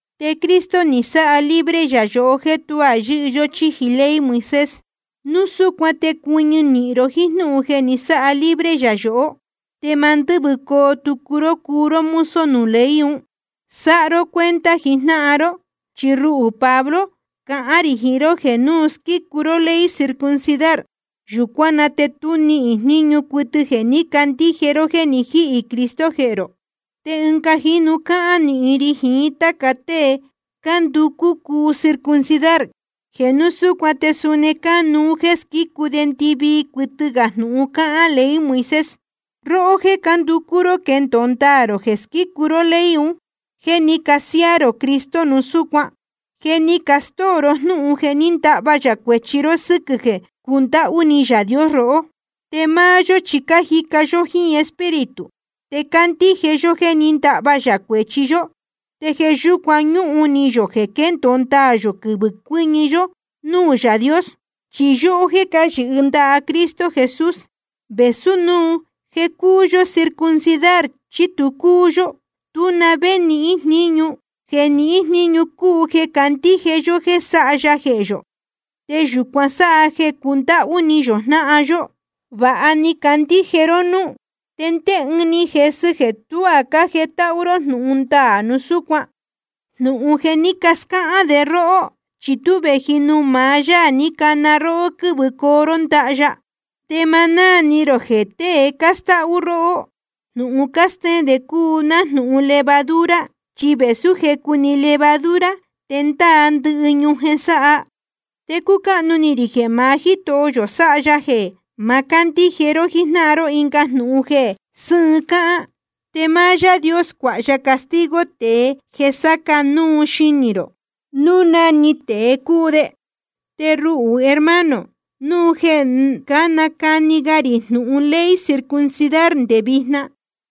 Te Cristo ni sáha libre yā yohó jéē tuá yɨ́hɨ yó chíji ley Moisés. Núu súcuan te cuɨñɨ nīhin ró jíín jnúhun jeē ni sáha libre yā yohó, te ma ndɨ́vɨcoo tucu ró cuu ró mozo nuū ley un. Sáha ró cuenta jijnáhan ró, chi ruhū Pablo cahán rī jiín ró jeē núu squícu ró ley circuncidar, yūcuán na te tu níhín jníñu cuɨtɨ jeē ní candíje ró jéē ni jíhī Cristo jehē rō. Te ɨnga jínu cáhán nīhin ri jiín táca tée cánducú cuu circuncidar, jeē núu súcuan te suni cánuú jéē squícu de ndɨvii cuɨtɨ gā jnūhun cáhán ley Moisés. Róhó jéē cánducú ró quendōo ndaā rō jeē squícu ró ley un, je ni casiáá rō Cristo núu súcuan. Je ni castóo ró jnúhun jeē ndahva yā cuēchi ró sɨ́quɨ̄ jeē cundáhú ni Yaā Dios rohó. Te máá yó chi cájica yó jíín Espíritu, te cácandíje yó jéē ní ndahva yā cuēchi yó, te jeē yúcuan ñúhun ni yō jeē quendōo ndaā yō quɨvɨ̄ cuɨ́ñɨ yó núū Yaā Dios. Chi yóhó jéē cáyɨhɨ ndaha Cristo Jesús, vēsú núu jeē cúu yó circuncidar chí tu cúu yó, tú na vé níhín jníñu. Jeē nihín jníñu cúu jeē candíje yó jeē sáha ya jehē yō. Te yūcuan sáha jeē cundáhú ni yō jnáhan yó. Vāha ni cacandíje ró núú. ¿Te ndé ɨɨn ni jesɨ jeē tuá cájetáhú ró jnūhun ndaā núu súcuan? Jnūhun jeē ní cascáhán de róhó, chi tú vēji nuū maá Yaā ní cana róhó ní quɨ̄vɨcoo ró ndaha ya. Te ma náā ni rō jeē tée cástáhú róhó, jnūhun cástéén de cúu nájnūhun levadura, chi vēsú jecu‑ni levadura, te ndáa ndɨhɨ ñujen sáha. Te cúcáhnu ni rī jeē maá Jítoho yō sáha ya jeē ma cándíje ró jíjnáhan ró ɨnga jnūhun jeē sɨ́ɨn cáhán. Te máá Yaā Dios cuāha ya castigo tēe jeē sáca núu xinī rō, núu na‑ni tēe cúu de. Te ruhū, hermano, núu jeē nácani ga rī jnūhun ley circuncidar nde vijna,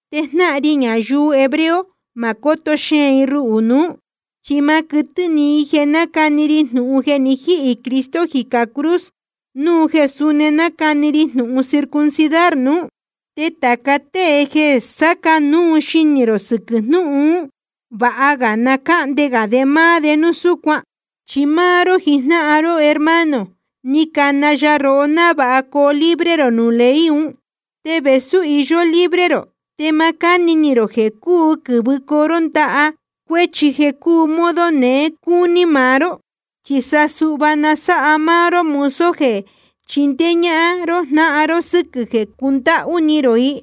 te jnáhan ri ñayuu hebreo ma cóto xeēn i ruhū nuú. Chi ma quɨtɨ́ ni i jeē nácani ri jnūhun jeē ni jíhī Cristo jicā cruz, núu jeē súni nácani ri jnūhun circuncidar nuú. Te tāca tée jeē sáca núu xinī rō sɨquɨ̄ jnúhun ún, vāha ga na cáhnde gā de máá de núu súcuan. Chi máá ró jijnáhan ró hermano, ni cana ya rohó návāha coo libre rō nuū ley un. Te vēsú iyó libre rō, te ma cáni ni rō jeē cúu quɨ̄vɨcoo ró táca cuéchi jeē cúu modo neé cúní maá ró, chi sa suhva na sáha ró máá ró mozo jeē chindéé ñáhán ró jnáhan ró sɨquɨ̄ jeē cundáhú ni rō i.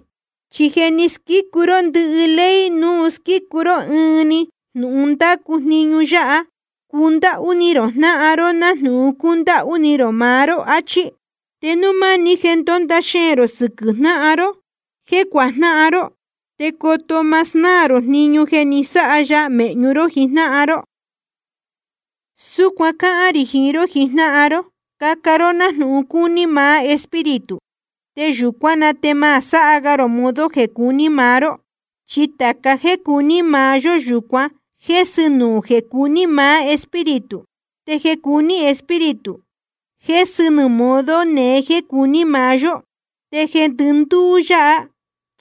Chi je ni squícu ró ndɨhɨ ley núu squícu ró ɨɨn‑ni jnūhun ndácu jniñu yáha: Cundáhú ni rō jnáhan ró nájnūhun cúndáhú ni rō maá ró, achí. Te núu máni jeē ndónda xeēn rō sɨquɨ̄ jnáhan ró jéē cuajnáhan ró, te coto ma snáā rō jniñu jeē ni sáha ya mēhñu ró jijnáhan ró. Súcuan cáhán rī jiín ró jijnáhan ró: Caca ró nájnūhun cúní maá Espíritu, te yūcuán na te ma sáha ga rō modo jeē cuní maá ró. Chi tāca jéē cuní maá yó, yūcuan jésɨ nuū jeē cuní maá Espíritu. Te jeē cuní Espíritu, jésɨ nuū modo neé jéē cuní maá yó. Te jeē ndɨndúú yáha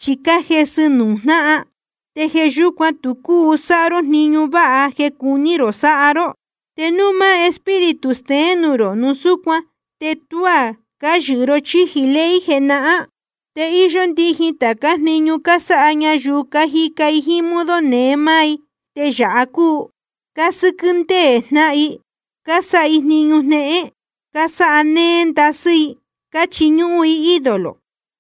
chi cájesɨ nuū jnáhan, te jeē yúcuan tu cúu sáha ró jniñu váha jeē cuní rō sáha ró. Te núu máá Espíritu steén nuū rō, núu súcuan te tuá cáyɨhɨ ró chíji ley jenahán. Te íyó ndijin tācá jniñu cásáha ñayuu cájica jíín modo neé máá, te yāha cúu: Cásɨ́quɨ́ ndéē jnáhan i, cásáha i jniñu jnéhén, cásáha néé ndasɨ́ i. Cáchiñúhún i ídolo,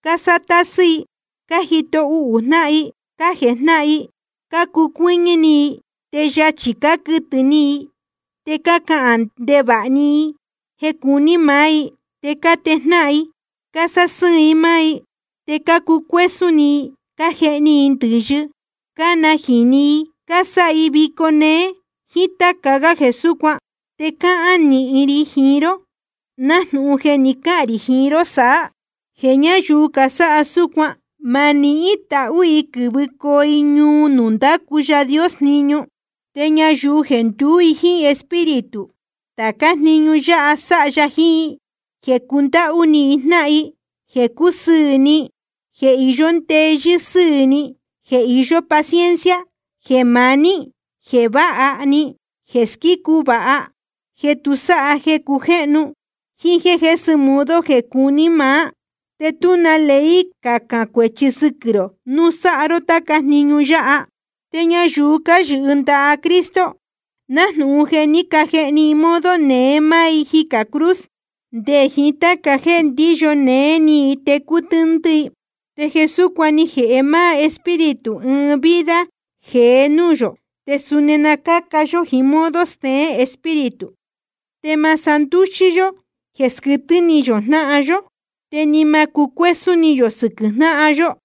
cásáha tásɨ́ i, cájito uhū jnáhan i, cájejnáhan i, cácucuɨ́ñɨ́ ni i. Te yachī cáquɨtɨ̄ ni i, te cándɨhvɨ̄ ni i jeē cúu máá‑ni i, te cátejnáhan i cásásɨ́ɨn i máá i. Te cácucuésún ni i, cájehni i ndɨ̄yɨ, cánajīni i, cásáha i vico néé, jíín táca gá jeē súcuan. Te cáhán nīhin ri jiín ró, nájnūhun je ni cahān rī jiín ró saá, jeē ñáyuu casáha súcuan, ma nihín tahú i quɨ̄vɨcoo i ñuu nuū ndácu Yaā Dios jniñu. Te ñayuu jeē nduú i jíín Espíritu, tācá jniñu yáha sáha ya jiín i: Jeē cundáhú ni jnáhan, jeē cúsɨɨ̄ ni, jeē iyó ndeyɨ́ sɨ́ɨ̄ ni, jeē iyó paciencia, jeē maní ni, jeē váha ni, jeē squícu vāha, jeē tu sáha jeē cujéhnu, jíín jéē jésɨ modo jeē cuní maá. Te tú na ley cacān cuēchi sɨquɨ̄ rō núu sáha ró táca jniñu yáha. Te ñayuu cáyɨhɨ ndaha Cristo, nájnūhun je ni cajehni i modo neé máá i jicā cruz, nde jiín táca jéē ndíyo néé ni i te cútɨ́ndɨ́ i. Te jeē súcuan ni jēhe máá Espíritu ɨɨn vida jeé núū yō, te suni na cáca yó jíín modo steén Espíritu. Te ma sandúxí yó jéē squɨtɨ́ ni yō jnáhan yó, te ni ma cucuésún ni yō sɨquɨ̄ jnáhan yó.